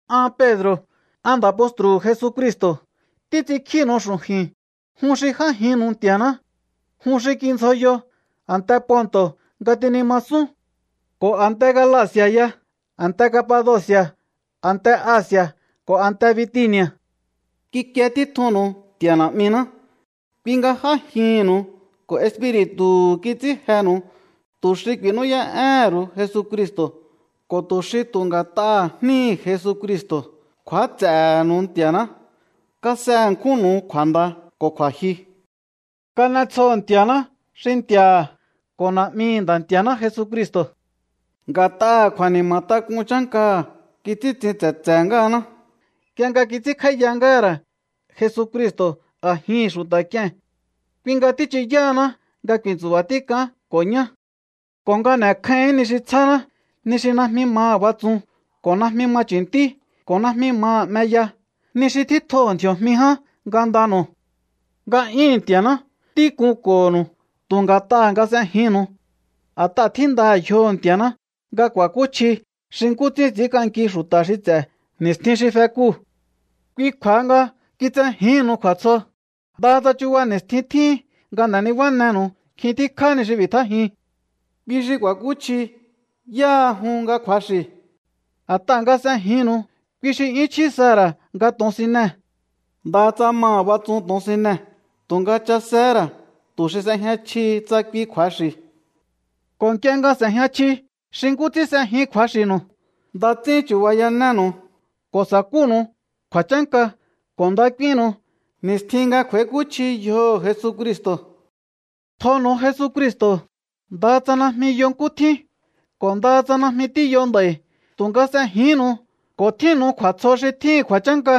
An Pedro̱, an nda̱ postru̱hu̱ Jesucristo̱ títs'inkjínu̱u xu̱ju̱i̱n jun xi j'ájinnu̱u Nti̱a̱ná. Jun xi kindzjoyo a̱nte Ponto̱ nga tinimasún, ko̱ a̱nte Galaci̱a̱ ya, a̱nte Capadoci̱a̱, a̱nte Asi̱a̱ ko̱ a̱nte Bitini̱a̱. Kikie títjunnu̱u Nti̱a̱ Na̱'miná, kui nga j'ájihi̱nnu̱u ko̱ Espiri̱tu̱hu̱ kits'ín jenu̱u, tu̱ xi ku̱i̱nú'yá'éhe̱n ru̱u Jesucristo̱ ko̱ tu̱ xi tu̱ nga̱t'aha̱ jníhi̱ Jesucristo̱ kju̱áts'e̱he̱nu̱u Nti̱a̱ná. Kas'e ṉkjúnnu̱u kju̱a̱nda ko̱ kju̱a̱jyu. Kan'etsjoho̱ Nti̱a̱ná xi Nti̱a̱ha̱ ko̱ Na̱'mihi̱ Nda̱ Nti̱a̱ná Jesucristo̱. Nga̱t'aha̱ kju̱a̱ni̱ma̱tak'un chánkaha̱ kits'íntsin tse̱tse̱ ngáhaná nk'ie nga kits'ínkj'áíya ngáha̱ ra̱ Jesucristo̱ a̱jihi̱n xu̱ta̱k'ie̱n. Kui nga tíchuyáhaná nga ku̱i̱ntsu̱ba̱ tík'aán ko̱ ñá ko̱ nga n'e̱kjáíhi̱ín ni xi tsjáná, ni xi najmi maha̱ batsun ko̱ najmi ma chu̱ntí ko̱ najmi maha̱ 'meya, ni xi tjítjoho̱ ndji̱o̱jmi ján ngandanu̱u. Nga'yúhu̱n Nti̱a̱ná tíkunko̱ho̱nu̱u tu̱ nga̱t'aha̱ nga s'ejinnu̱u. A̱t'aha̱ tjíndaha̱ yjoho̱ Nti̱a̱ná nga ku̱a̱kúchji xi nkú ts'ín ts'i̱ínk'anki xu̱ta̱ xi ts'e̱ ni̱stjin xi fekuu̱. Kui kju̱a̱ha nga kitsejíhi̱nnu̱u kju̱a̱tsjo, ndaha tsa chuba ni̱stjin tjíhin nga n'e̱ nibánenu̱u nkjin tíkjá ni xi ku̱i̱tjájiun. Kui xi ku̱a̱kúchji yáha jun nga kju̱axi̱. A̱t'aha̱ nga s'ejinnu̱u, kui xi 'yún chjí saha̱ ra̱ nga to̱onsinee̱. Ndaha tsa maha̱ batsun to̱onsinee̱, tu̱nga chasehé ra̱ tu̱ xi s'ejña chjihi tsa kui kju̱axi̱. Ko̱ nk'ie nga s'e̱jña chji xi nkú ts'ín s'ejin kju̱axi̱nu̱u, nda ts'ín chu̱bayanénu̱u ko̱ sa̱kúnu̱u kju̱a̱chánka ko̱ nda k'úínnu̱u ni̱stjin nga kj'u̱a̱íkúchji yjoho̱ Jesucristo̱. Tjonu̱u Jesucristo̱, ndaha tsa najmi yo nkú tjín. Ko̱ ndaha tsa najmi tíyo nd'a̱i̱, tu̱nga s'ejihínnu̱u ko̱ tjínnu̱u kju̱a̱tsjo xi tjíhi̱n kju̱a̱chánka,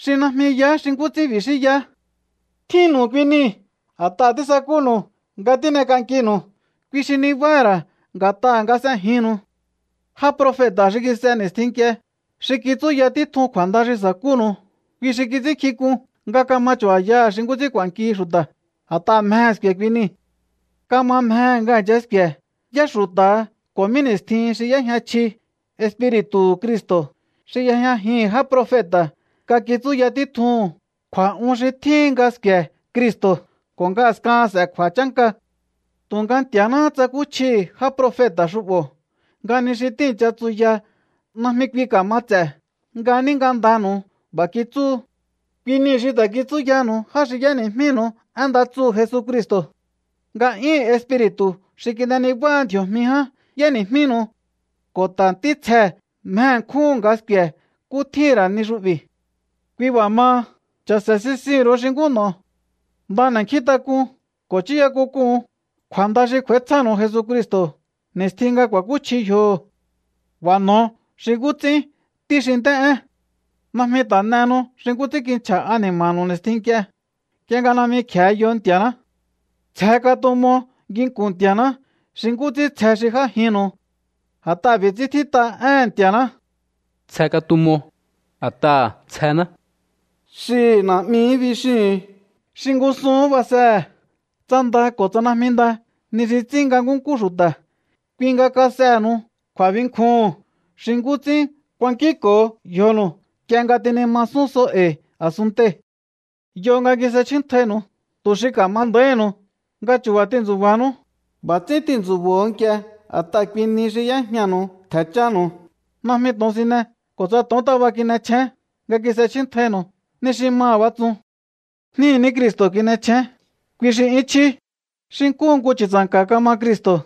xi najmi yaá xi nkú ts'ín bixíyaá. Tjínnu̱u kui nii̱ a̱t'aha̱ tísakúnu̱u nga tín'ek'ankinu̱u, kui xi nibáha̱ ra̱ nga̱t'aha̱ nga s'ejinnu̱u. Já profeta̱ xi kis'e ni̱stjin nk'ie, xi kitsúya títjun kju̱a̱nda xi sa̱kúnu̱u, kui xi kits'ínnkjink'un nga ka̱ma chu̱ba̱yaha̱ xi nkú ts'ín k'u̱a̱nkihi xu̱ta̱, a̱t'aha̱ mjehe̱ sku̱e̱ kui nii̱. Kama mjehe̱ nga i̱ncha sku̱e̱ yá xu̱ta̱ha ko̱ mí ni̱stjihin xi y'éjña chji Espiri̱tu̱hu̱ Cristo̱ xi y'ejñajihi̱n já profeta̱ nga kitsúya títjuhu̱n kju̱a̱'un xi tjíhin nga sku̱e̱ Cristo̱ ko̱ nga a̱skahan s'e̱ kju̱a̱chánka. Tu̱nga Nti̱a̱náhá tsakúchjihi̱ já profeta̱ xu'bo̱ nga ni xi tíi̱ncha tsuya najmi kui ka̱mats'e̱, nga ní ngandanu̱u b'a̱ kitsúhu. Kui niu̱ xi ta̱ kitsúyanu̱u já xi y'éni̱jmínu̱u én nda tsuhu̱ Jesucristo̱. Nga'yúhu̱n Espiri̱tu̱ xi kin'e nibáha ndji̱o̱jmi ján y'éni̱jmíhi̱nu̱u. Ko̱ ta̱ ntítsjee̱ mje ṉkjúhu̱n nga sku̱e̱ nkú tjíhi̱n ra̱ ni xu'bi̱. Kui b'a̱ maha, cha̱se̱ sisihi̱n ru̱u xi nkú n'o̱o. Nda n'e̱nkjíntak'un ko̱ chúya k'unk'uhu̱un kju̱a̱nda xi kj'u̱a̱ítsjánu̱u Jesucristo̱ ni̱stjin nga ku̱a̱kúchji yjoho̱. B'a̱ n'o̱o xi nkú ts'ín ntí xi nt'é'én. Najmi ta̱ n'ehenu xi nkú ts'ín kinchja̱ ani̱ma̱nu̱u ni̱stjin nk'ie, nk'ie nga najmi kje̱e yo Nti̱a̱ná. Tsje katumo nginku̱n Nti̱a̱ná, xi nkú ts'ín tsje xi j'ájinnu̱u. A̱t'aha̱ b'i̱ ts'ín tjít'a éhe̱n Nti̱a̱ná: “Tsje katumo, a̱t'aha̱ tsjená.” Xihi̱ “Na̱'mihí” bixíhu̱un xi ngúsuhún basehe̱ tsa nda ko̱ tsa najmi nda ni xi ts'ín nga nkúnkú xu̱ta̱, kui nga kas'enu̱u kju̱a̱binkjuhu̱n xi nkú ts'ín kuankínko̱o yjonu̱u nk'ie nga ti̱nimasún so e̱i̱ a̱sunntei̱. Yo nga kis'echjíntjainu̱u tu̱ xi ka̱ma nda̱íhi̱nu̱u nga chu̱ba̱ tintsu̱ba̱nú. B'a̱ ts'ín tintsu̱bo̱o nk'ie a̱t'aha̱ kui nihi xi y'éjñanu̱u ntje̱ chánu̱u. Najmi to̱onsine ko̱ tsa to̱ontaba kin'echjén nga kis'echjíntjainu̱u, ni xi maha̱ batsun. Jníhi̱ ní Cristo̱ kin'echjén, kui xi 'yún chjí. Xi nkúhu nku chu̱tsa̱nka̱ kama Cristo̱,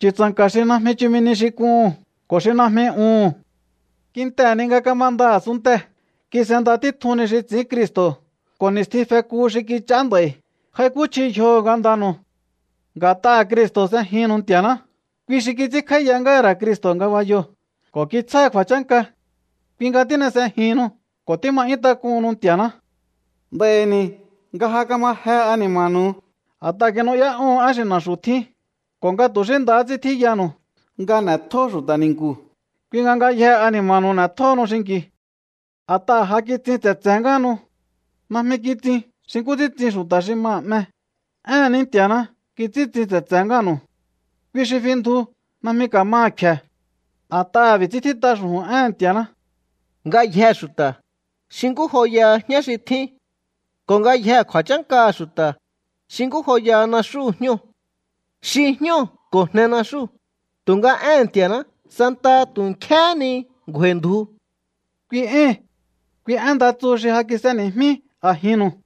chu̱tsa̱nka̱ xi najmi chumi nihi xi k'uhu̱n ko̱ xi najmi uhu̱n. Kintehe̱ ni nga kamanda a̱sunntee̱ kis'enda títjun ni xi ts'i̱ín Cristo̱, ko̱ ni̱stjin feku xi kich'aá nd'a̱i̱ j'aikúchji yjoho̱ ngandanu̱u. Nga̱t'aha̱ Cristo̱ s'ejihi̱nnu̱u Nti̱a̱ná, kui xi kits'ínkj'áíya ngáha̱ ra̱ Cristo̱ ngabayoo̱ ko̱ kitsjáha̱ kju̱a̱chánka. Kui nga tín'e s'ejihinnu ko̱ tíma 'yún tak'uhunnu Nti̱a̱ná. Nd'a̱i̱ ni̱ nga ja kamaje ani̱ma̱nu̱u a̱t'aha̱ kinu'yá'óho̱on én xi na̱xu̱ tjín ko̱ nga tu̱ xí ndahá ts'ín tjíyanu̱u nga n'e̱tjó xu̱ta̱ ni̱nku̱, kui nga ngayjee̱ ani̱ma̱nu̱u n'e̱tjóhonu xinki̱u. A̱t'aha̱ ja kitsin tse̱tse̱ ngáhanu. Najmi kitsiun xi nkú ts'ín tsin xu̱ta̱ xi maha̱ 'me. Éhe̱n ní Nti̱a̱ná kits'íntsin tse̱tse̱ ngáha̱nu̱u. Kui xi fi ndju. Najmi ka̱maha̱ kfe̱. A̱t'aha̱ b'i̱ ts'ín tjít'a xu̱ju̱n éhe̱n Nti̱a̱ná: Ngayjee̱ xu̱ta̱, xi nkú joyaha jñá xi tjín. Ko̱ ngayjee̱ kju̱a̱chánkaha̱ xu̱ta̱, xi nkú joyaha naxúhu̱ jñóo̱. Xi jñóo̱ ko̱ jne naxúu̱, tu̱nga éhe̱n Nti̱a̱ná santaha tu̱ nkjéhé ni ngju̱a̱i̱ ndju. Kui ée̱n, kui én nda tsu xi ja kis'eni̱jmí a̱jinnu̱u.